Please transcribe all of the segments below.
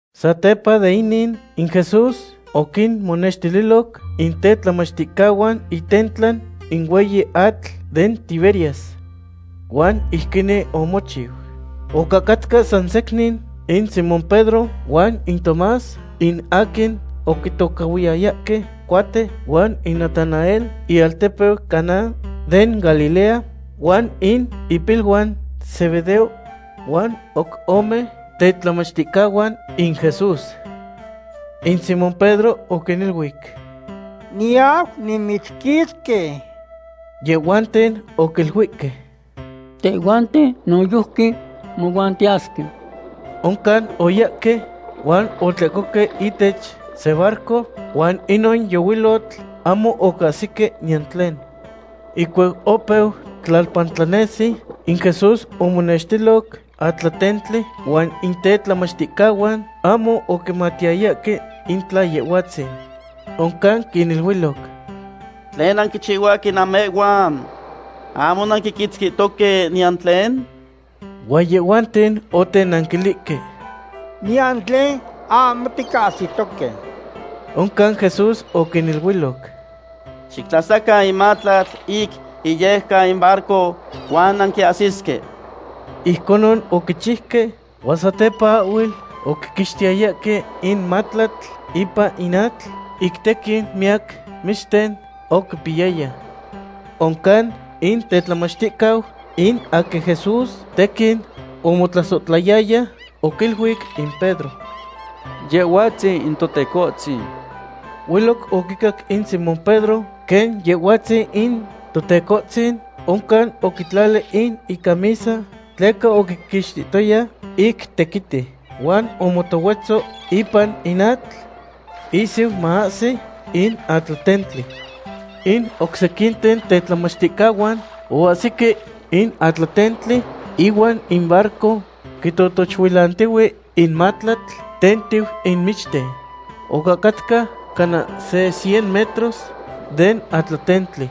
Satepa de inin, in Jesús oquinmonextililoc in tetlamachticahuan itentla in hueyi atl den Tiberias. Huan ijquinin omochiu. Ocahcatca san secnin in Simón Pedro, huan in Tomás in aquin oquitocahhuiyayahque Cuate, huan in Natanael, ialtepeu Caná den Galilea, huan in ipiluan Zebedeo huan oc ome tetlamachticahuan in Jesús. In Simón Pedro oquiniluic: ―Niyau nimichquitzqui. Yehhuanten oquiluihque: ―Tehhuanten noyojqui mohuan tiyasque. Oncan oyahque, huan otlehcohque ihtech se barco, huan inon yohuilotl ahmo oquiahsique niyan tlen. Ihcuac opeu tlalpa tlanesi, in Jesús omonextiloc atlatentli, huan in tetlamachticahuan ahmo oquimatiyayahque in tla Yehhuatzin. Oncan quiniluiloc: ―¿Tlen nanquichihuahque namehhuan? ¿Ahmo nanquiquitzquihtoque niyan tlen? Huan yehhuanten otenanquilihque: ―Niyan tlen ahmo ticahsitoque. Oncan Jesús oquiniluiloc: ―Xictlasacan in matlatl ic iyejcan in barco, huan nanquiahsisque. Ijconon oquichiuque, huan satepa ahhuel oquiquixtiyayahque in matlatl ipan in atl, ic tequin miyac michten oquipiyaya. Oncan in tetlamachticau in aquin Jesús tequin omotlasohtlayaya oquiluic in Pedro: ―¡Yehhuatzin in Totecohtzin! Hueloc oquicac in Simón Pedro quen Yehhuatzin in Totecohtzin, oncan oquitlali in icamisa (tleca oquiquixtihtoya ic tequiti), huan omotohuetzo ipan in atl, ihsiu maahsi in atlatentli. In oc sequinten tetlamachticahuan oahsique in atlatentli ihuan in barco, quitotochuilantihue in matlatl tentiu in michten. Ocahcatca cana se cien metros den atlatentli.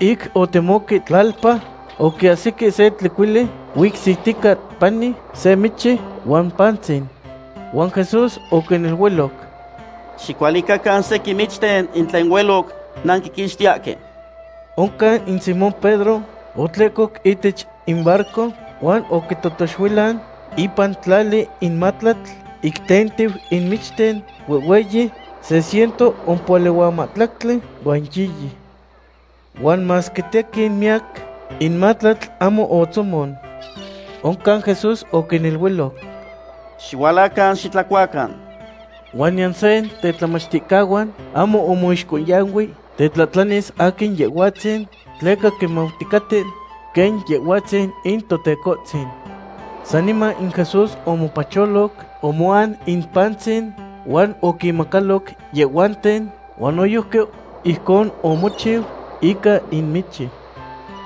Ic otemoque tlalpa, oquiahsique se tlecuili, huicsitica pani se michi huan pantzin. Huan Jesús oquiniluiloc: ―Xicualicacan sequin michten in tlen hueloc nanquiquixtiyahque. Oncan in Simón Pedro otlehcoc ihtech in barco huan oquitotochuilan ipan tlali in matlatl ic tentiu in michten huehhueyi, se ciento ompohuali huan mahtlactli huan yiyi. Huan masque tequin miyac, in matlatl ahmo otzomon. Oncan Jesús oquiniluiloc: ―Xihualacan xitlacuacan. Huan niyan seya den tetlamachticahuan ahmo omoixcohyanui tetlahtlanis aquin Yehhuatzin, tleca quimauticaten quen Yehhuatzin in Totecohtzin. Saniman in Jesús omopacholoc, omoan in pantzin huan oquinmacaloc yehhuanten, huan noyojqui ijcon omochiu ica in michi.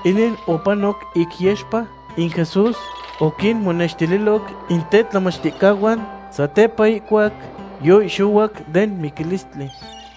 Inin opanoc ic yexpa in Jesús oquinmonenextililoc in tetlamachticahuan satepa ihcuac yoihxohuac den miquilistli.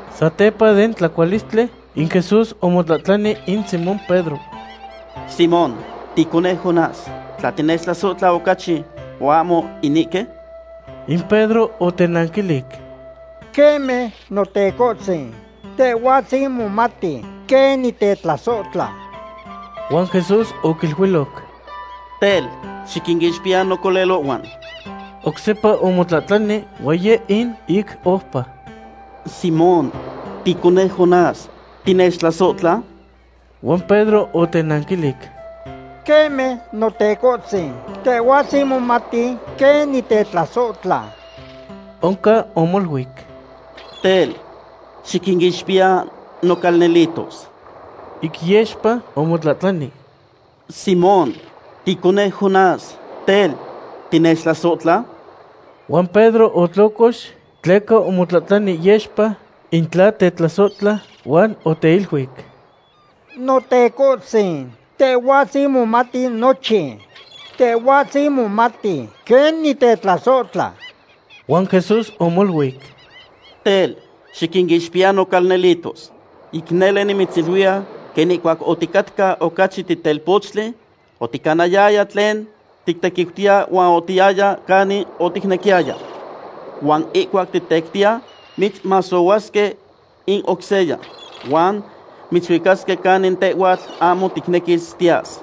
Satepa den tlacualistli, in Jesús omotlahtlani in Simón Pedro: ―Simón, ticoneu Jonás, ¿tla tinechtlasohtla ocachi huan ahmo inihque? In Pedro otenanquilic: ―Queme, Notecohtzin, Tehhuatzin momati quen nitetlasohtla. Huan Jesús oquiluiloc: ―Tel, xiquinixpiya nocolelohhuan. Oc sepa omotlahtlani huan yeh in ic oupa. ―Simón, ticoneu Jonás, ¿tinechtlasohtla? Huan Pedro otenanquilic: ―Queme, Notecohtzin, Tehhuatzin momati quen nitetlasohtla. Oncan omoluic: ―Tel, xiquinixpiya nocalnelitos. Ic yexpa omotlahtlani: ―Simón, ticoneu Jonás, tel, ¿tinechtlasohtla? Huan Pedro otlocox tleca omotlahtlani yexpa in tla tetlasohtla, huan oteiluic: ―Notecohtzin, Tehhuatzin momati nochin. Tehhuatzin momati quen nitetlasohtla. Huan Jesús omoluic: ―Tel, xiquinixpiya nocalnelitos. Ic nele nimitziluiya quen ihcuac oticatca ocachi titelpochtli, oticanayaya tlen tictequiutiya huan otiyaya canin oticnequiyaya. Huan ihcuac titectiya, mitzmasohuasque in oc seya, huan mitzuicasque canin tehhuatl ahmo ticnequis tiyas.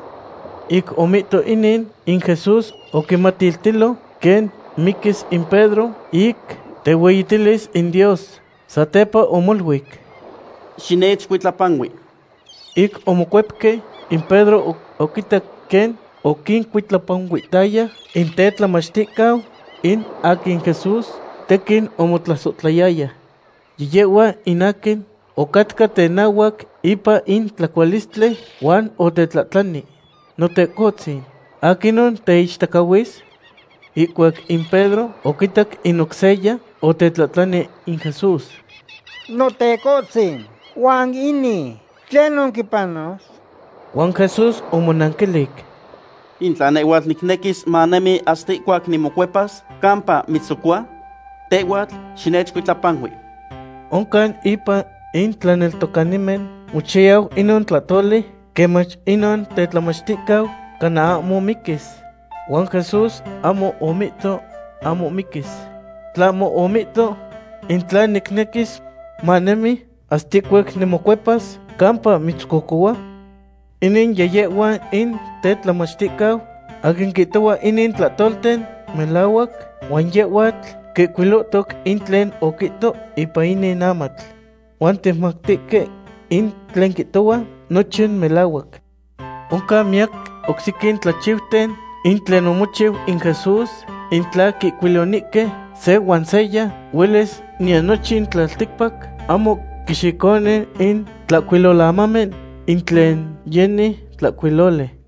Ic omihto inin, in Jesús oquimatiltilo quen miquis in Pedro ic tehueyitilis in Dios. Satepa omoluic: ―¡Xinechcuitlapanui! Ic omocuepque, in Pedro oquitac quen oquincuitlapanuihtaya in tetlamachticau in aquin Jesús tequin omotlasohtlayaya. Yiyehhua in aquin ocatca tenahuac ipan in tlacualistli huan otetlahtlani: “Notecohtzin, ¿aquinon teichtacahuis?” Ihcuac in Pedro oquitac in oc seya, otetlahtlani in Jesús: ―Notecohtzin, huan inin, ¿tlenon quipanos? Huan Jesús omonanquilic: ―In tla nehhuatl nicnequis manemi hasta ihcuac nimocuepas, ¿campa mitzcocua? Tehhuatl xinechcuitlapanui. Oncan impan in tlaneltocanimen mochayau inon tlahtoli quen mach inon tetlamachticau cana ahmo miquis. Huan Jesús ahmo omihto ahmo miquis. Tlahmo omihto: “In tla nicnequis manemi hasta ihcuac nimocuepas, ¿campa mitzcocohua?” Inin yiyehhua in tetlamachticau aquin quihtohua inin tlahtolten melahuac, huan yehhuatl quihcuilohtoc in tlen oquihto ipan inin amatl. Huan ticmatihque in tlen quihtohua nochin melahuac. Oncan miyac oc sequin tlachiuten in tlen omochiu in Jesús, in tla quihcuilonihque se huan seya, huelis niyan nochin tlalticpac ahmo quixiconi in tlahcuilolamamen in tlen yeni tlahcuiloli.